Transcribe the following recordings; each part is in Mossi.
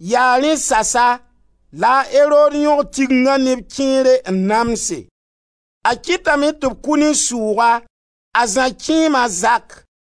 Yaa rẽ sasa la a Erod yõg Tigenga neb kẽere n namse. A kɩtame tɩ b kʋ ne sʋʋga a Zã kẽema, a Zak.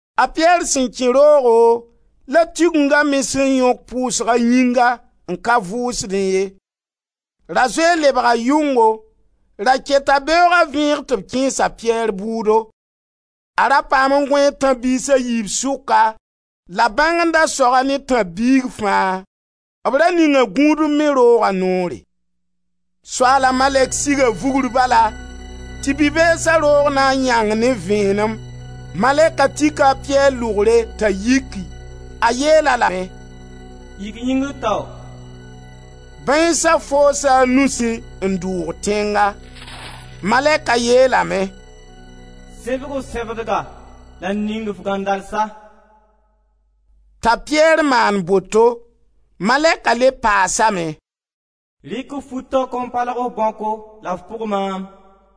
A Piyɛr sẽn kẽ roogo la Tigenga me sẽn yõk pʋʋsg a yĩnga n ka vʋʋsdẽ ye. Ra zoe n lebga yʋngo, ra keta beooga vẽeg tɩ b kẽes a Piyɛr bʋʋdo. A ra paam n gõee tãb-biis a yiib sʋka la bãng n da sog-a ne tãb-biig fãa. B ra ninga gũudb me rooga noore. Soaala malɛk siga vugr bala tɩ bi-beesa roog na n yãng ne vẽenem. Malɛka tika a Piyɛr lʋgre t'a yiki. A yeel-a lame: «Yik yĩngr tao!» Bãeensa foosa a nusẽ n dʋʋg tẽnga. Malɛka yeelame: «Sẽbg f sẽbdga la ning f gãndalsa.» T'a Piyɛr maan boto. Malɛka le paasame: «Rɩk f fu taokã n palg f bãoko la f pʋg maam.»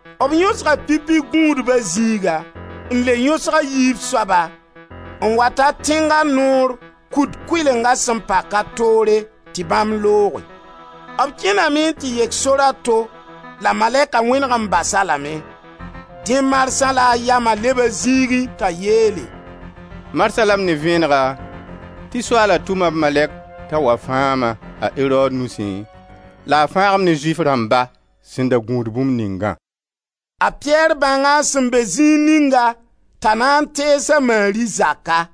B yõsga pipi gũudba zĩiga, n le yõsg a yiib soaba, n wa ta tẽnga noor kut kʋɩlenga sẽn paka toore tɩ bãmb looge. B kẽname n tɩ yek sor a to la malɛka wẽneg n bas-a lame. Dẽ marsã la a yama leb a zĩigẽ t'a yeele: «Marsã la m ne vẽenega tɩ Soaala tʋma b malɛk t'a wa fãag-ma a Erod nusẽ la a fãag-m ne Zʋɩf rãmba sẽn da gũud bũmb ningã.» A Piyɛr bãnga a sẽn be zĩig ninga t'a na n tees a Mari zaka.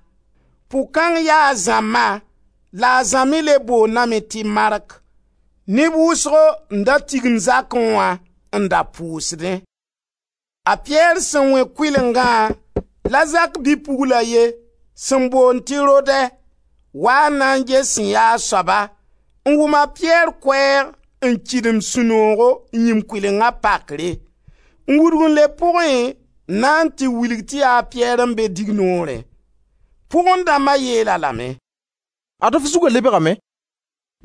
Pʋg kãng ya a Zã ma la a Zã me le boondame tɩ Mark. Neb wʋsgo n da tigim zakã, n da pʋʋsdẽ. A Piyɛr sẽn vẽ kʋɩlengã la zak bi-pugl a ye, sẽn boond tɩ Rodɛ, waa n na n ges sẽn yaa soaba, n wʋm a Piyɛr koɛɛg, n kɩdem sũ-noogo n yĩm kʋɩlenga pakre, n wudg n leb pʋgẽ n na n wilg tɩ ya a Piyɛr n be dignoorẽ. Pʋgẽ dãmba yeel-a lame: «Ad-f zuga lebgame.»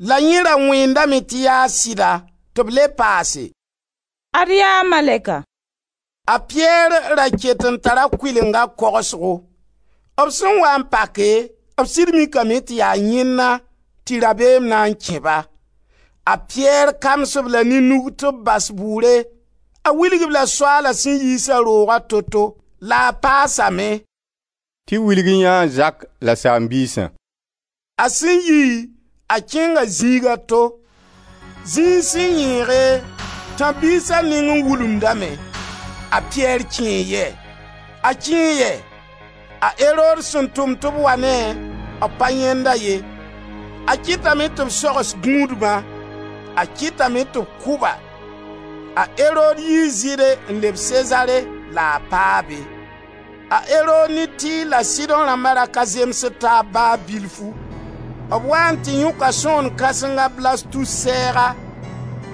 La yẽ ra wẽendame tɩ yaa sɩda. Tɩ b le paase: «Ad yaa Malɛka!» A Piyɛr ra ket n tara kʋɩlenga kogsgo. B sẽn waa n pake b sɩd mikame tɩ yaa yẽnna tɩ rabeem na n kẽ-ba. A Piyɛr kams-b la ne nug tɩ b bas bʋʋre; a wilg-b la Soaala sẽn yiis-a rooga toto la a paasame: «Tɩ wilg yã a Zak la saam-biisã.» A sẽn yi, a kẽnga zĩig a to. Zĩig sẽn yẽege, tãb-biisa nengẽ wulumdame: a Piyɛr kẽe yɛ? A kẽe yɛ? A Erod sẽn tʋm tɩ b wa ne-a, b pa yãend-a ye. A kɩtame tɩ b sogs gũudbã, a kɩtame tɩ b kʋ ba. A Erod yii Zɩɩde n leb Sezare la a paa be. A Erod ne Tir la Sidõ rãmba ra ka zemsd taab ba bilfu. B waa n tɩ yõka sõgen kãseng, a Blastus, sɛɛga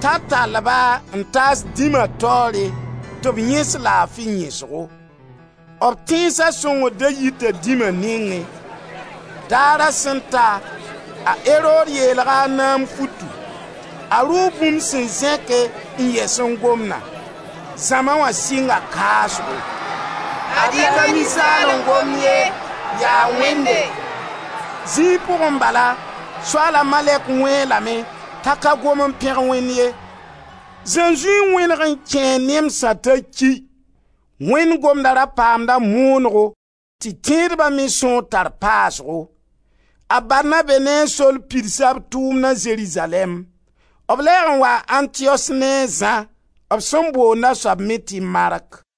t'a tall-ba n taas dĩma taoore tɩ b yẽs laafi yẽsgo. B tẽnsa sõngr da yita dĩma nẽngẽ. Daara sẽn ta, a Erod yeelga a naam futu. A rʋʋ bũmb sẽn zẽke n yɛs n gomda. Zãma wã sɩnga kaasgo: «Ad-y ka ninsaal n gomd ye, yaa wẽnde!» Zĩig pʋgẽ bala, Soaala malɛk wẽe-a lame t'a ka gom n pẽg Wẽnd ye. Zãnzũy n wẽneg m kẽe a nemsã t'a ki. Wẽnd gomda ra paamda moonego tɩ tẽedba me sõor tar paasgo. A Barnabe ne a Sol pidsa b tʋʋmna Zerizalɛɛm. B lɛɛg n waa Antiyos ne a Zã, b sẽn boonda soab me tɩ Mark.